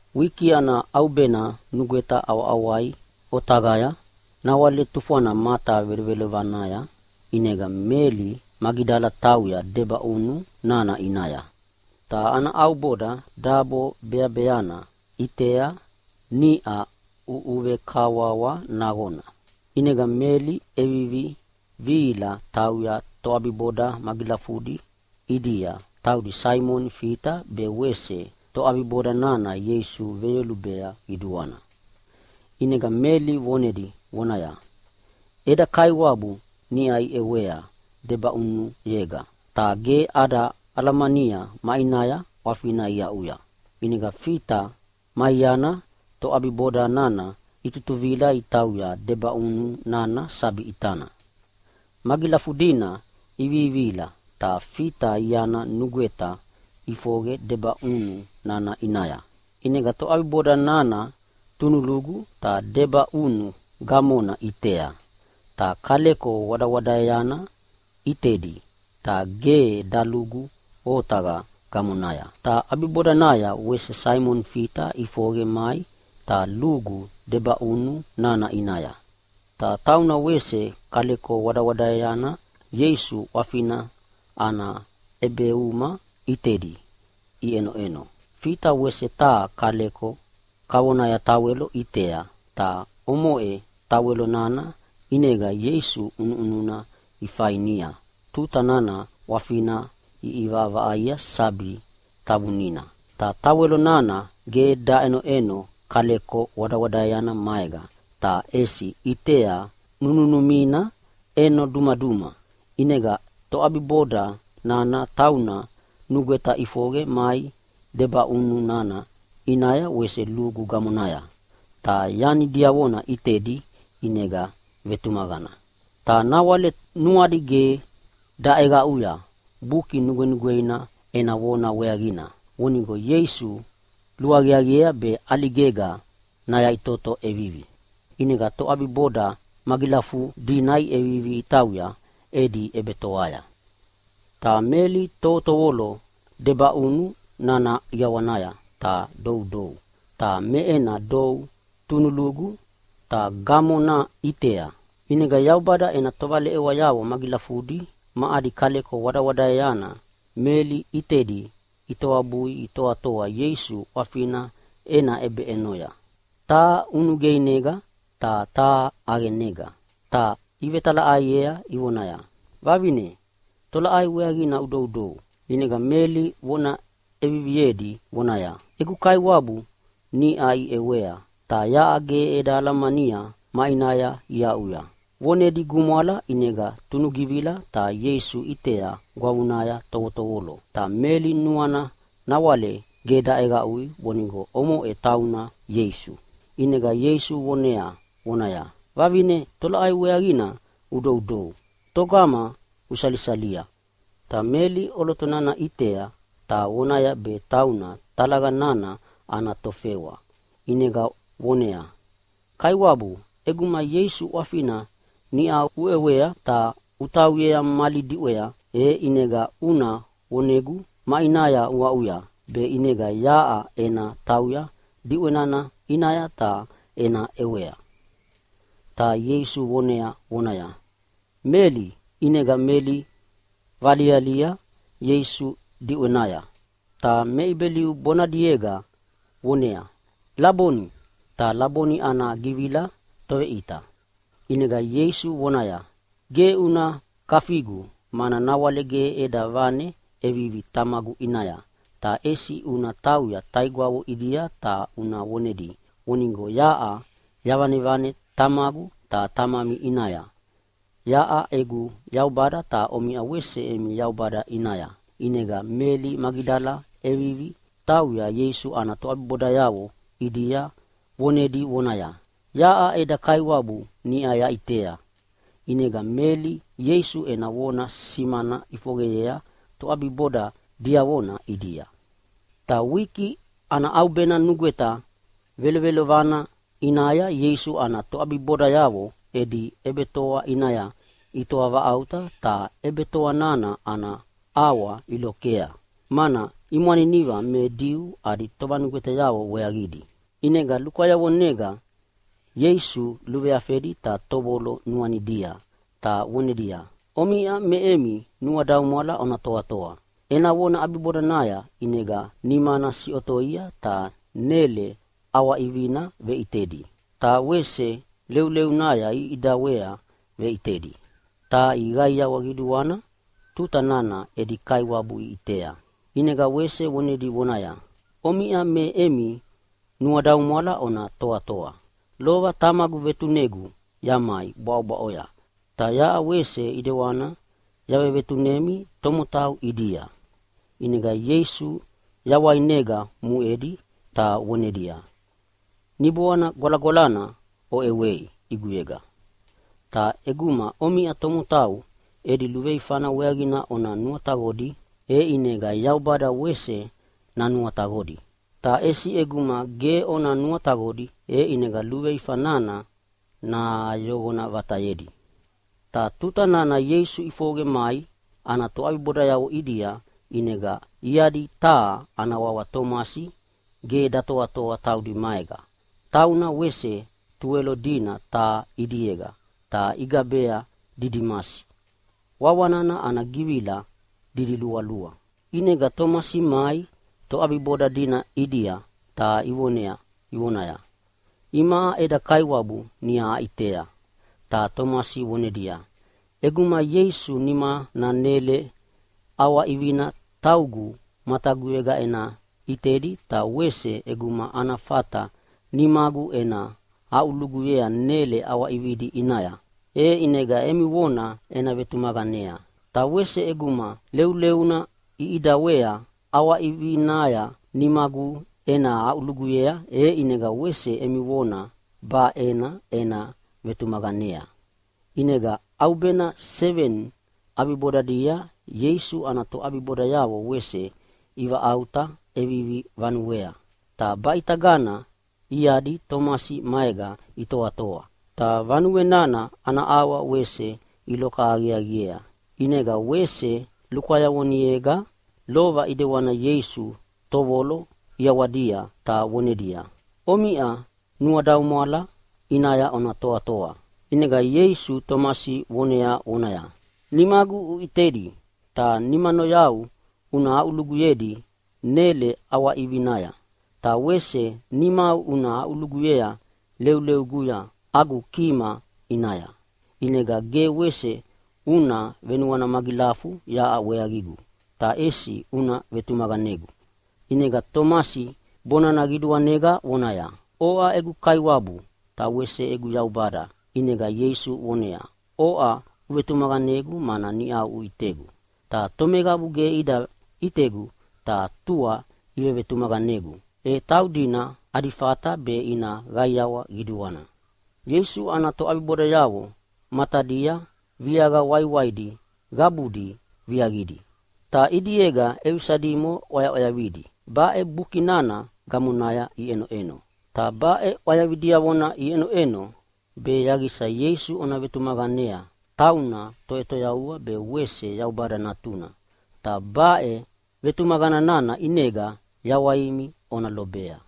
Wiki ana ʼaubena nugweta ʼawaʼawai otaqaya, nawale tufwana mata velovelovanaya, ʼinega Meli Magidala tauya debaʼunu nana ʼinaya. Ta ana ʼauboda dabo beabeana ʼitea niʼa ʼuʼuvekawawa naqona. ʼInega Meli ʼevivi vihila tauya toʼabiboda magilafudi ʼidia, taudi Saimoni Fita ta wese toʼabiboda nana Ieisu veyolubea qiduana. ʼInega Meli vonedi vonaya, “Eda Kaiwabu niʼa iʼewea debaʼunuyega, ta ge ada alamania maʼinaya ʼwafina iaʼuya!” ʼInega Fita ma iana toʼabiboda nana itutuvila itauya debaʼunu nana sabi ʼitana. Magilafudina ivivihila ta Fita iana nugweta ʼifoqe debaʼunu nana ʼinaya. ʼInega toʼabiboda nana tunulugu ta debaʼunu gamona ʼitea, ta kaleko wadawadaeana ʼitedi, ta ge dalugu otaqa gamonaya. Ta ʼabibodanaya wese Saimoni Fita ʼifoqe mai ta lugu debaʼunu nana ʼinaya. Ta tauna wese kaleko wadawadaeana Ieisu ʼwafina ana ʼebeuma ʼitedi iʼenoʼeno. Fita wese taha kaleko kavona tawelo ʼitea, ta omoʼe tawelo nana ʼinega Ieisu ʼunuʼununa ifainia tuta nana ʼwafina iʼivaʼavaʼaia sabi tavunina. Ta tawelo nana ge daʼenoʼeno kaleko wadawadaeana maega, ta ʼesi ʼitea nununumina ʼeno duma. ʼInega toʼabiboda nana tauna nugweta ʼifoqe mai debaʼunu nana ʼinaya wese lugu gamonaya. Ta yani diavona ʼitedi ʼinega vetumaqana. (Ta nawale nuadi ge daʼeqaʼuya Buki Nugwenugweina ena vona weaqina, vonigo Ieisu luaqiaqiea be ʼaligega nayaʼitoto ʼevivi.) ʼInega toʼabiboda magilafudina iʼevivi itauya edi ʼebetoaya. Ta Meli tovotovolo debaʼunu nana ʼiawanaya ta doudou. Ta me ena dou tunulugu ta gamona ʼitea. ʼInega Yaubada ena tovaleʼewayavo magilafudi ma adi kaleko wadawadaeana Meli ʼitedi itoabui itoatoa Ieisu ʼwafina ena ʼebeʼenoya, taha ʼunugeinega ta taha ʼaqenega. Ta ivetalaʼaiea ivonaya, “Vavine, tolaʼai weaqina udoudou?” ʼInega Meli vona ʼeviviedi vonaya, “Egu Kaiwabu niʼa iʼewea, ta yaʼa ge eda alamania maʼinaya iaʼuya.” Vonedi gumwala ʼinega tunugivila ta Ieisu ʼitea gwavunaya tovotovolo, ta Meli nuana nawale ge daʼeqaʼui vonigo omoʼe tauna Ieisu. ʼInega Ieisu vonea vonaya, “Vavine, tolaʼai weaqina udoudou? Togama usalisalia?” Ta Meli ʼoloto nana ʼitea ta vonaya be tauna talaqa nana ana tofewa, ʼinega voneaya, “Kaiwabu, ʼeguma Ieisu ʼwafina niʼa uʼewea ta utauyea mali diʼwea, e ʼinega una vonegu maʼinaya uaʼuya, be ʼinega yaʼa ena tauya diʼwe nana ʼinaya ta ena ʼewea.” Ta Ieisu vonea vonaya, “Meli.” ʼInega Meli valialia Ieisu diʼwenaya, ta me Ibeliu bonadiega voneaya, “Laboni.” (Ta Laboni ana givila Toveʼita). ʼInega Ieisu vonaya, “Ge una kafigu, mana nawale ge eda vane ʼevivi Tamagu ʼinaya. Ta ʼesi una tauya taigwavo ʼidia ta una vonedi vonigo yaʼa yavanevane Tamagu ta Tamami ʼinaya, yaʼa egu Yaubada ta omiʼa wese emi Yaubada ʼinaya” ʼInega Meli Magidala ʼevivi tauya Ieisu ana toʼabibodayavo ʼidia vonedi vonaya, “Yaʼa eda Kaiwabu niʼa yaʼitea!” ʼInega Meli Ieisu ena vona simana ʼifoqeyea toʼabiboda diavona ʼidia. Ta wiki ana ʼaubena nugweta velovelovana ʼinaya Ieisu ana toʼabibodayavo edi ʼebetoa ʼinaya itoa vaʼauta, ta ʼebetoa nana ana ʼawa ilokea, mana imwaniniva me Diu adi tovanugwetayavo weaqidi. ʼInega lukwayavonega Ieisu luveafedi ta tovotovolo nuanidia, ta vonedia, “Omiʼa me emi nuadaumwala ona toatoa.” Ena vona ʼabibodanaya ʼinega nimana siʼotoi ta nele ʼawaʼivina veʼitedi, ta wese leuleunaya iʼidawea veʼitedi. Ta iqaiawa qiduana tuta nana edi Kaiwabu iʼitea. ʼInega wese vonedi vonaya, “Omiʼa me emi nuadaumwala ona toatoa. Lova Tamagu vetunegu yamai bwaʼobwaʼoya, ta yaʼa wese ʼedewanina yavevetunemi tomotau ʼidia.” ʼInega Ieisu yawainega muʼedi, ta vonedia, “Niboana Gwalagwalana oʼewei ʼiguyega. Ta ʼeguma omiʼa tomotau edi luveifana weaqina ona nuataqodi, e ʼinega Yaubada wese nanuataqodi. Ta ʼesi ʼeguma ge ona nuataqodi, e ʼinega luveifa nana nayoqona vatayedi.” Ta tuta nana Ieisu ʼifoqe mai ana toʼabibodayavo ʼidia, ʼinega iadi taha ana wawa Tomasi ge datoatoa taudi maega. Tauna wese Tuwelo dina taha ʼidiega ta igabea Didimasi (wawa nana ana givila didilualua). ʼInega Tomasi mai toʼabiboda dina ʼidia, ta ivonea ivonaya, “Imaʼa eda Kaiwabu niʼa aʼitea!” Ta Tomasi vonedia, “ʼEguma Ieisu nimana nele ʼawaʼivina taugu mataguyega ena ʼitedi ta wese ʼeguma ana fata nimagu ena aʼuluguyea nele ʼawaʼividi ʼinaya, e ʼinega emi vona ena vetumaqanea. Ta wese ʼeguma leuleuna iʼidawea ʼawaʼivinaya nimagu ena aʼuluguyei, e ʼinega wese emi vona benaʼe ena vetumaqanea.” ʼInega ʼaubena seveni ʼabibodanaya Ieisu ana toʼabibodayavo wese ivaʼauta ʼevivi vanuea, ta baʼitagana iadi Tomasi maega itoatoa. Ta vanue nana ana ʼawa wese iloka aqiaqiea. ʼInega wese lukwayavonega lova ʼidewani Ieisu tovolo ʼiawadia ta vonedia, “Omiʼa nuadaumwala ʼinaya ona toatoa.” ʼInega Ieisu Tomasi vonea vonaya, “Nimagu una ʼitedi ta nimanoyau una aʼuluguyea nele ʼawaʼivinaya. Ta wese nimau una aʼuluguyea leulueguya agu kima ʼinaya. ʼInega ge wese una venuana magilafu yaʼa weaqigu. Ta ʼesi una vetumaqanegu!” ʼInega Tomasi bonana qiduanega vonaya, “Oʼa egu Kaiwabu, ta wese egu Yaubada!” ʼInega Ieisu voneaya, “Oʼa uvetumaqanegu mana niʼa uʼitegu. Ta tomeqabu ge ida ʼitegu ta tua ivevetumaqanegu, e taudina adi fata be ina qaiawa qiduana.” Ieisu ana toʼabibodayavo matadia viaqa waiwaidi qabudi viaqidi. Ta ʼidiega ʼevisa dimo ʼwayaʼwayavidi baʼe buki nana gamonaya iʼenoʼeno. Ta baʼe ʼwayavi diavona iʼenoʼeno be yaqisa Ieisu ona vetumaqanea tauna Toʼetoyavua be wese Yaubada Natuna, ta baʼe vetumaqana nana ʼinega yawaimi ona lobea.